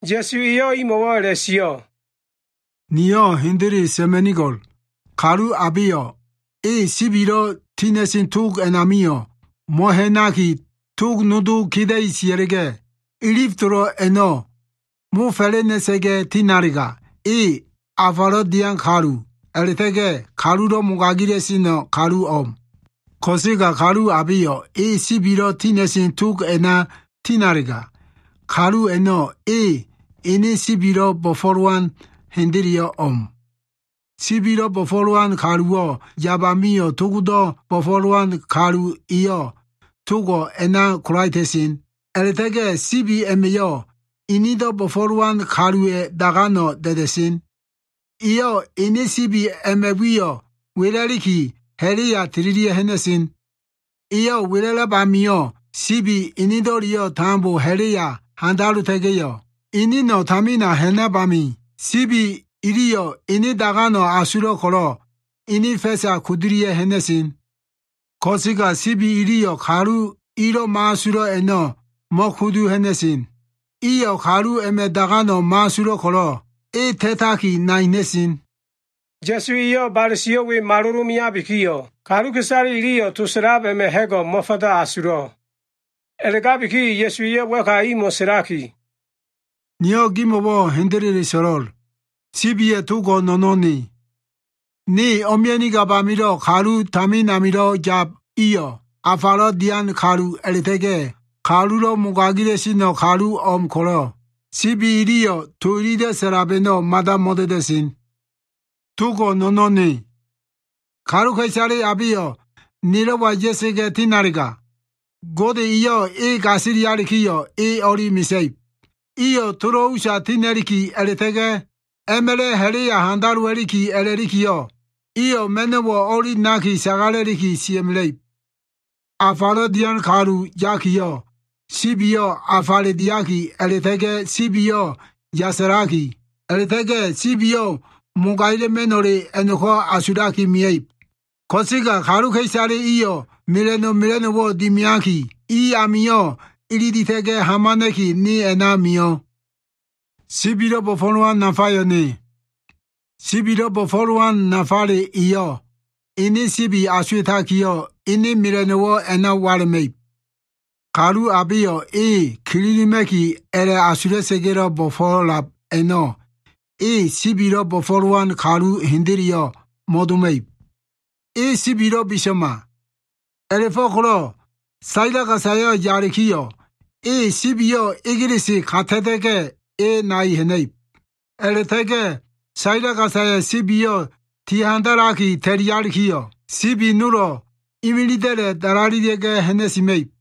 Ya꞉su eyo꞉ imo꞉wo꞉ a꞉la꞉sio꞉, “Niyo꞉ hendele sa꞉ma꞉nigo꞉l. Kalu abeyo꞉ e sibilo꞉ tina꞉sen tog a꞉namio꞉ mo꞉ha꞉naki, tog nodo keda꞉i sia꞉la꞉ga꞉ ilif tolo꞉ a꞉no꞉ mofa꞉la꞉na꞉sa꞉ga꞉ tinalega, e afalo꞉ dian kalu, a꞉la꞉ta꞉ga꞉ kalulo꞉ mogaila꞉seno꞉ kaluwo꞉ o꞉m. Ko꞉sega kalu abeyo꞉ e sibilo꞉ tina꞉sen tog a꞉na tinalega, kalu a꞉no꞉ e ene sibilo꞉ bo꞉fo꞉lowan hendeleyo꞉ o꞉m. Sibilo꞉ bo꞉fo꞉lowan kaluwo꞉ yab amio꞉ togdo꞉ bo꞉fo꞉lowan kalu eyo꞉ togo꞉ a꞉na kolaeta꞉sen. A꞉la꞉ta꞉ga꞉ sibi a꞉ma꞉yo꞉ inido꞉ bo꞉fo꞉lowan kaluwa꞉ dagano꞉ da꞉da꞉sen. Eyo꞉ ene sibi a꞉ma꞉ wiyo꞉ wela꞉liki, ha꞉la꞉ya tililia꞉ ha꞉na꞉sen. Eyo꞉ wela꞉lab amio꞉ sibi enedo꞉leyo꞉ tambo ha꞉la꞉ya handalota꞉ga꞉yo꞉, eneno꞉ tamina ha꞉nab amio꞉, sibi iliyo꞉ ene dagano꞉ asulo꞉ ko꞉lo꞉, ene fa꞉sa kudulia꞉ ha꞉na꞉sen. Ko꞉sega sibi iliyo꞉ kalu ilo꞉ mo꞉asulo꞉ a꞉no꞉ mo꞉kudu ha꞉na꞉sen. Iyo꞉ kalu a꞉ma꞉ dagano꞉ mo꞉asulo꞉ ko꞉lo꞉ e ta꞉taki nai ha꞉na꞉sen.” Ya꞉su eyo꞉ bale sio꞉ we malilo꞉ meabikiyo꞉, kaluka꞉isale iliyo꞉ to sa꞉lab a꞉ma꞉ ha꞉go꞉ mo꞉fanda asulo꞉. A꞉la꞉gabiki Ya꞉suwa꞉yo꞉ wa꞉ka imo꞉ sa꞉laki, “Niyo꞉ gimo꞉wo꞉ hendele so꞉lo꞉l. Sibiya꞉ togo꞉ no꞉no꞉n Ne. Ne o꞉mia꞉nigab amilo꞉ kalu tamin amilo꞉ yab iyo꞉ afalo꞉ dian kalu a꞉la꞉ta꞉ga꞉ kalulo꞉ mogaila꞉sen kaluwo꞉ o꞉m ko꞉lo꞉, sibi iliyo꞉ to ililo꞉ sa꞉lab a꞉no꞉ mada mo꞉da꞉da꞉sen. Togo꞉ no꞉no꞉n Ne. Kaluka꞉isale abeyo꞉ nelo꞉wa ya꞉sa꞉ga꞉ tinalega, Gode eyo꞉ e gasilialikiyo꞉, e o꞉li mesa꞉ib. Iyo꞉ tolo꞉ usa tina꞉liki, a꞉la꞉ta꞉ga꞉ a꞉ma꞉la꞉ ha꞉la꞉ya handalowa꞉liki a꞉lalikiyo꞉, iyo꞉ ma꞉no꞉wo꞉ o꞉li naki, sagala꞉li sia꞉mela꞉ib. Afalo꞉ dian kalu yakiyo꞉ sibiyo꞉ afale diaki a꞉la꞉ta꞉ga꞉ sibiyo꞉ yasalaki, a꞉la꞉ta꞉ga꞉ sibiyo꞉ mogaila꞉ma꞉no꞉le a꞉no꞉ko꞉ asulaki mia꞉ib. Ko꞉sega kaluka꞉isale iyo꞉ mela꞉no꞉ mela꞉no꞉wo꞉ dimiaki, i amio꞉ ililita꞉ga꞉ hamana꞉ki, ne a꞉na mio꞉. “Sibilo꞉ bo꞉fo꞉lowan nafayo꞉ Ne. Sibilo꞉ bo꞉fo꞉lowan nafale eyo꞉ ene sibi asuwa꞉takiyo꞉ ene mela꞉no꞉wo꞉ a꞉na wala꞉ma꞉ib. Kalu abeyo꞉ e kililima꞉ki a꞉la꞉ asula꞉sa꞉ga꞉lo꞉ bo꞉fo꞉lab a꞉no꞉ e sibilo꞉ bo꞉fo꞉lowan kalu hendeleyo꞉ mo꞉doma꞉ib. E sibilo꞉ biso꞉ma. A꞉la꞉fo꞉ko꞉lo꞉ saila gasayo꞉ yalikiyo꞉, e sibiyo꞉ egelese ka ta꞉ta꞉ga꞉, e nai ha꞉na꞉ib. A꞉la꞉ta꞉ga꞉ saila gasaya꞉ sibiyo꞉ ti handalaki ta꞉lialikiyo꞉, sibi nolo꞉ imilida꞉la꞉ dalalelia꞉ga꞉ ha꞉na꞉sima꞉ib.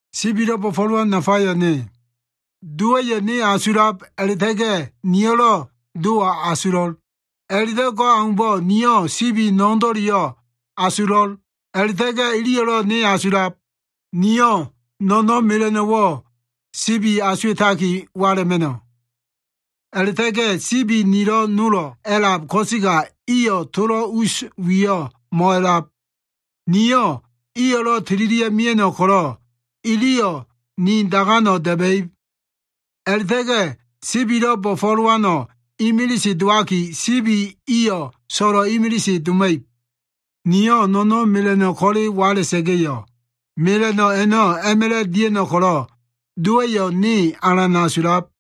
“Sibilo꞉ bo꞉fo꞉lowan nafayo꞉ Ne. Dowa꞉yo꞉ ne asulab a꞉la꞉ta꞉ga꞉ niyo꞉lo꞉ Dowo꞉ asulo꞉l. A꞉la꞉do꞉ go꞉ aumbo꞉ niyo꞉ sibi no꞉no꞉ndo꞉leyo꞉ asulo꞉l a꞉la꞉ta꞉ga꞉ iliyo꞉lo꞉ ne asulab. Niyo꞉ no꞉no꞉n mela꞉no꞉wo꞉ sibi asuwa꞉taki wala꞉ma꞉no꞉. A꞉la꞉ta꞉ga꞉ sibi nilo꞉ nolo꞉ a꞉lab ko꞉sega iyo꞉ tolo꞉ us wiyo꞉ mo꞉a꞉lab. Niyo꞉ iyo꞉lo꞉ tililia꞉ mia꞉no꞉ ko꞉lo꞉ iliyo꞉ ni dagano꞉ da꞉ba꞉ib. A꞉la꞉ta꞉ga꞉ sibilo꞉ bo꞉fo꞉lowano꞉ imilise dowaki, sibi iyo꞉ so꞉lo꞉ imilise doma꞉ib. Niyo꞉ no꞉no꞉n mela꞉no꞉ ko꞉le wala꞉sa꞉ga꞉yo꞉, mela꞉no꞉ a꞉no꞉ a꞉ma꞉la꞉ dia꞉no꞉ ko꞉lo꞉, Dowa꞉yo꞉ ne alan asulab.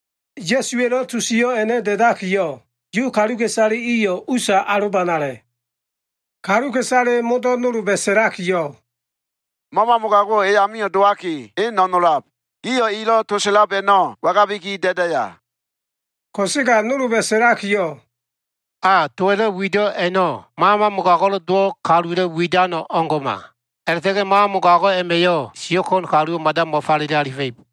Ya꞉suwa꞉lo꞉ to sio꞉ a꞉no꞉ da꞉dakiyo꞉, Yu kaluka꞉isale iyo꞉ usa alobanale. Kaluka꞉isale modo꞉ nolba꞉ sa꞉lakiyo꞉, “Mama mogago꞉wo꞉ e amio꞉ dowaki, e no꞉nolab. Gio꞉ elo꞉ to sa꞉lab a꞉no꞉ wangabiki da꞉daya?” Ko꞉sega nolba꞉ sa꞉lakiyo꞉ “A, to elo꞉ wido꞉ a꞉no꞉, mama mogago꞉lo꞉ dowo꞉ kaluwa꞉lo꞉ widan o꞉ngo꞉ma. A꞉la꞉ta꞉ga꞉ mama mogago꞉ a꞉ma꞉yo꞉ siyo꞉ ko꞉n kaluwo꞉ mada mo꞉falele alifa꞉ib.”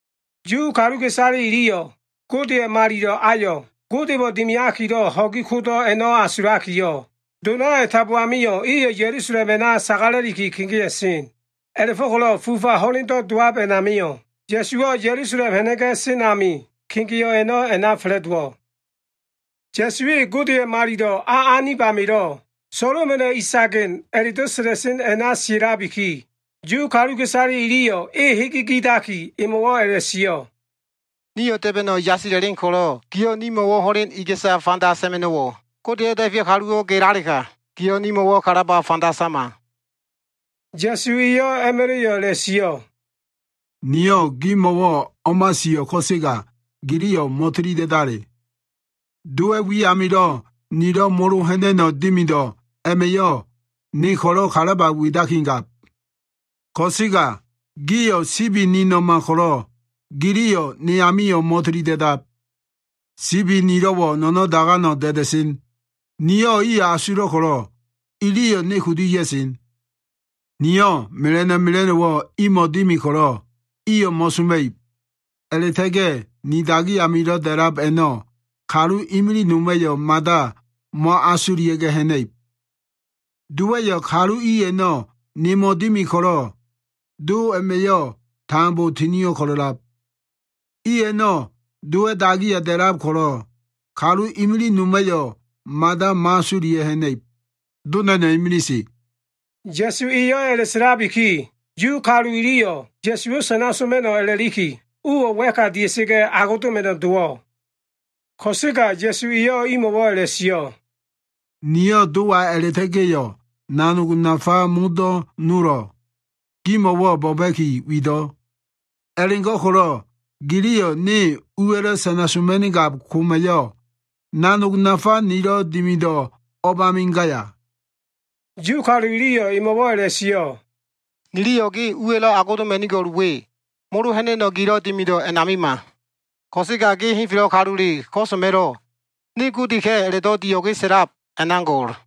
Yu kaluka꞉isale iliyo꞉ Godeya꞉ Malilo꞉ ayo꞉ Godemo꞉ dimiakilo꞉ ho꞉gi kodo꞉ a꞉no꞉ asulakiyo꞉, donayo꞉ tambo amio꞉ iyo꞉ Ya꞉lusalem a꞉na sagala꞉liki kegea꞉sen. A꞉la꞉fo꞉ko꞉lo꞉ fufa ho꞉lendo꞉ dowab a꞉namio꞉, Ya꞉suwo꞉ Ya꞉lusalem ha꞉na꞉ga꞉ sen ami, kegeo꞉ a꞉no꞉ a꞉na fa꞉la꞉dowo꞉. Ya꞉su e Godeya꞉ Malilo꞉ a anib amilo꞉ “Solomona꞉ Isagen” a꞉la꞉do꞉ sa꞉la꞉sen a꞉na sia꞉labiki, Yu kaluka꞉isale iliyo꞉ e hege gidaki, emo꞉wo꞉ a꞉la꞉sio꞉, “Nio꞉ da꞉ba꞉no꞉ yasila꞉len ko꞉lo꞉ giyo꞉ nimo꞉wo꞉ ho꞉len iga꞉sa fanda sa꞉ma꞉no꞉wo꞉? Godeya꞉lo꞉ Da꞉feyo꞉ kaluwo꞉ gelalega, giyo꞉ nimo꞉wo꞉ kalaba fanda sama.” Ya꞉su eyo꞉ a꞉ma꞉la꞉yo꞉ a꞉la꞉sio꞉, “Niyo꞉ gimo꞉wo꞉ o꞉ma sio꞉, ko꞉sega giliyo꞉ mo꞉tili da꞉dale. Dowa꞉ wi amilo꞉ nilo꞉ molo ha꞉na꞉no꞉ dimido꞉ a꞉ma꞉yo꞉, ne ko꞉lo꞉ kalaba widakigab. Ko꞉sega gio꞉ sibi nino꞉ma ko꞉lo꞉, giliyo꞉ ne amio꞉ mo꞉tili da꞉dab. Sibi nilo꞉wo꞉ no꞉no꞉n dagano꞉ da꞉da꞉sen. Niyo꞉ iyo꞉ asulo꞉ ko꞉lo꞉, iliyo꞉ ne kudu ya꞉sen. Niyo꞉ mela꞉no꞉ mela꞉no꞉wo꞉ imo꞉wo꞉ dimi ko꞉lo꞉ iyo꞉ mo꞉soma꞉ib. A꞉la꞉ta꞉ga꞉ ni dagi amilo꞉ da꞉lab a꞉no꞉ kalu imilig noma꞉yo꞉ mada mo꞉asulia꞉ga꞉ ha꞉na꞉ib. Dowa꞉yo꞉ kalu i a꞉no꞉ nemo꞉ dimi ko꞉lo꞉, Do a꞉ma꞉yo꞉ tambo tinio꞉ ko꞉lo꞉lab. I a꞉no꞉ Dowa꞉ dagiya da꞉lab ko꞉lo꞉, kalu imilig noma꞉yo꞉ mada mo꞉asulia꞉ga꞉ ha꞉na꞉ib. Do na꞉no꞉ imilise.” Ya꞉su eyo꞉ a꞉la꞉sa꞉labiki, Yu kalu iliyo꞉ Ya꞉suwo꞉ sana soma꞉no꞉ a꞉la꞉liki, uwo꞉ wa꞉ka dia꞉sa꞉ga꞉ agodoma꞉no꞉ dowo꞉. Ko꞉sega Ya꞉su eyo꞉ imo꞉wo꞉ a꞉la꞉sio꞉, “Niyo꞉ Dowa a꞉la꞉ta꞉ga꞉yo꞉ nanog nafa modo꞉ nolo꞉ gimo꞉wo꞉ bo꞉ba꞉ki wido꞉. A꞉la꞉go꞉ko꞉lo꞉ giliyo꞉ ne uwa꞉lo꞉ sana soma꞉nigab koma꞉yo꞉, nanog nafa nilo꞉ dimido꞉ o꞉bami gaya?” Yu kalu iliyo꞉ emo꞉wo꞉ a꞉la꞉sio꞉, “Niliyo꞉ ge uwa꞉lo꞉ agodoma꞉nigo꞉l we, molo ha꞉na꞉no꞉ gilo꞉ dimido꞉ a꞉namima. Ko꞉sega ge henfelo꞉ kalule ko꞉so꞉ma꞉lo꞉, ‘Ne Godeka꞉’ a꞉la꞉do꞉ dio꞉ge sa꞉lab a꞉na go꞉l.”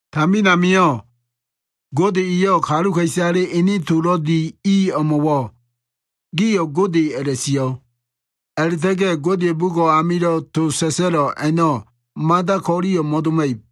Tamin amio꞉ Gode eyo꞉ kaluka꞉isale ene tolo꞉ di i o꞉mo꞉wo꞉ ‘Gio꞉ gode’ a꞉la꞉sio꞉. A꞉la꞉ta꞉ga꞉ Godeya꞉ bugo꞉ amilo꞉ to sa꞉sa꞉lo꞉ a꞉no꞉ mada ko꞉liyo꞉ mo꞉doma꞉ib.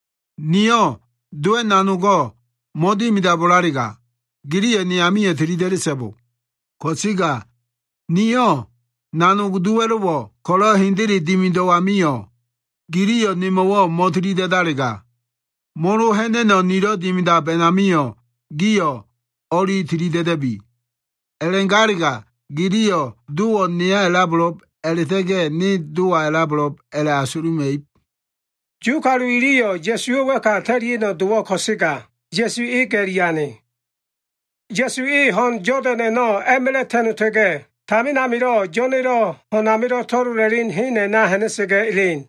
Niyo꞉ Dowa꞉ nanogo꞉ mo꞉dimidabo꞉lalega, giliyo꞉ ne amio꞉ tilida꞉da꞉so꞉bo. Ko꞉sega niyo꞉ nanog Dowa꞉lo꞉wo꞉ ko꞉lo꞉ hendele dimido꞉ amio꞉, giliyo꞉ ne amio꞉ mo꞉tili da꞉dalega, molo ha꞉na꞉no꞉ nilo꞉ dimidab a꞉namio꞉ gio꞉ o꞉li tili da꞉da꞉bi. A꞉la꞉galega Dowo꞉ neya a꞉labo꞉lo꞉b a꞉la꞉ta꞉ga꞉ ne Dowa a꞉labo꞉lo꞉b a꞉la꞉bo꞉ giliyo꞉ asuluma꞉ib.” Yu kalu iliyo꞉ Ya꞉suwo꞉ wa꞉ka ta꞉lia꞉no꞉ dowo꞉ ko꞉sega, Ya꞉su e ga꞉li ane. Ya꞉su e ho꞉n Yodan a꞉no꞉ a꞉ma꞉la꞉ ta꞉nota꞉ga꞉, tamin amilo꞉ Yo꞉na꞉lo꞉ ho꞉n amilo꞉ to꞉lola꞉len hen a꞉na ha꞉na꞉sa꞉ga꞉ elen.